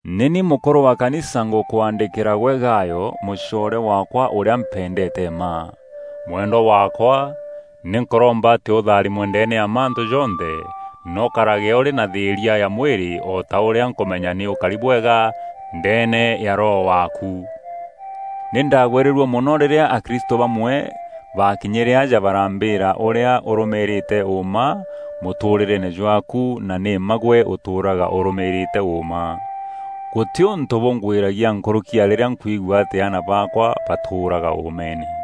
Nî ni mûkûrû wa Kanisa ngûkwaandîkîra gwe Gayo, mûcoore waakwa ûrîa mpendeete mma. Mwendwa waakwa, nî nkûromba atî ûtharimwe ndeene ya mantû jonthe na ûkarage ûrî na thîîria ya mwîrî o ta ûrîa nkûmenya nî ûkari bwega ndeene ya roho waaku. Nî ndagwîrîrue mono rîrîa akristû bamwe baakinyîre aja barambîîra ûrîa ûrûûmîîrîte ûûma mûtûûrîreene jwaaku na nî mma gwe ûtûûraga ûrûmîîrîte ûûma. Gûtî ûntû bûngwîragia nkûrûki ya rîrîa nkwigua atî aana baakwa batûûraga ûûmeene.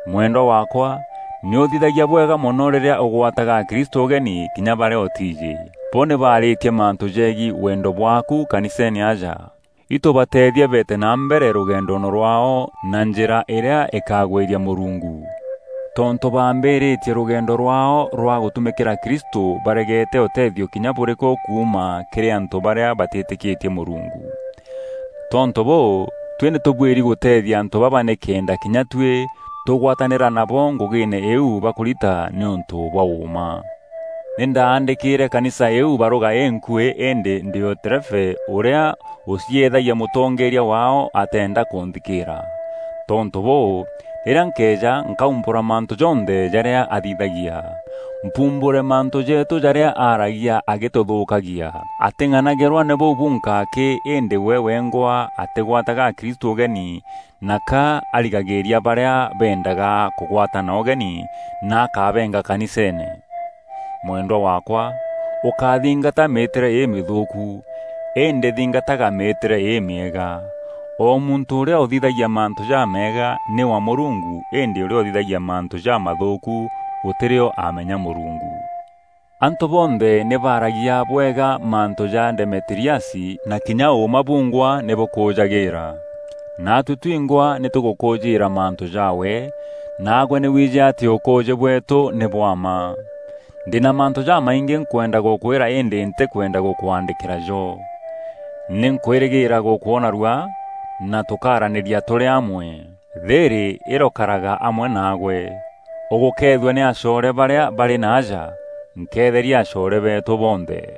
Mwendwa waakwa, nî ûthithagia bwega mono rîrîa ûgwataga akristû ûgeni, kinya barîa ûtiijî. Bo nî baarîtie mantû jegiî wendo bwaaku kaniseene aja. Itû bateethie beete na mbere rûgendoone rwaao na njîra îrîa îkagwîria Mûrungu. Tontû baambîrîîtie rûgendo rwaao rwa gûtumîkîra Kristû baregete ûtethio kinya bûrîkû kuuma kîrî antû barîa batîtîkîtie Mûrungu. Tontû bûû, tuî nî tûbuîri gûteethia antû baba nîkenda kinya tuî tûgwatanîra nabo ngûgîîne îîu bakûrita nîûntû bwa ûûma. Nî ndaandîkîîre kanisa îîu barûga înkuî îndî Diotrefe, ûrîa ûcieethagia mûtongeeria waao, atenda kûnthikîîra. Tontû bûû, rîrîa nkeeja, nkaumbûra mantû jonthe jarîa athithagia; mpumbûre mantû jeetû jarîa aaragia agîtûthûûkagia. Atîng'anagîrwa nî bûu bunka akî îndî we wengwa atîgwataga akristû ûgeni na ka arigagîîria barîa beendaga kûgwatana ûgeni na akabeenga kaniseene. Mwendwa waakwa, ûkáthingata mîîtîre îmîthûûku, îndî thingataga mîîtîre îmîega. O muntû ûrîa ûthithagia mantû jameega, nî wa Mûrungu îndî ûrîa ûthithagia mantû jamathûûku gûtî rîo aamenya Mûrungu. Antû bonthe nî baaragia bwega mantû ja Demetiriasi; na kinya ûûma bungwa nî bûkûûjagîîra. Naatuî twingwa nî tûgûkûûjîîra mantû jaawe, naagwe nî wiijî atî ûkûûjî bweetû nî bwa mma. Ndî na mantû jamaingî nkwenda gûkwîra îndî ntîkwenda gûkwaandîkîra jo. Nî nkwîrîgîîra gûkwona rua, na tûkaaranîria tûrî amwe. Thîîrî îrokaraga amwe naagwe. Ûgûkeethua nî acoore barîa barî naaja. Nkeetheria acoore beetû bonthe.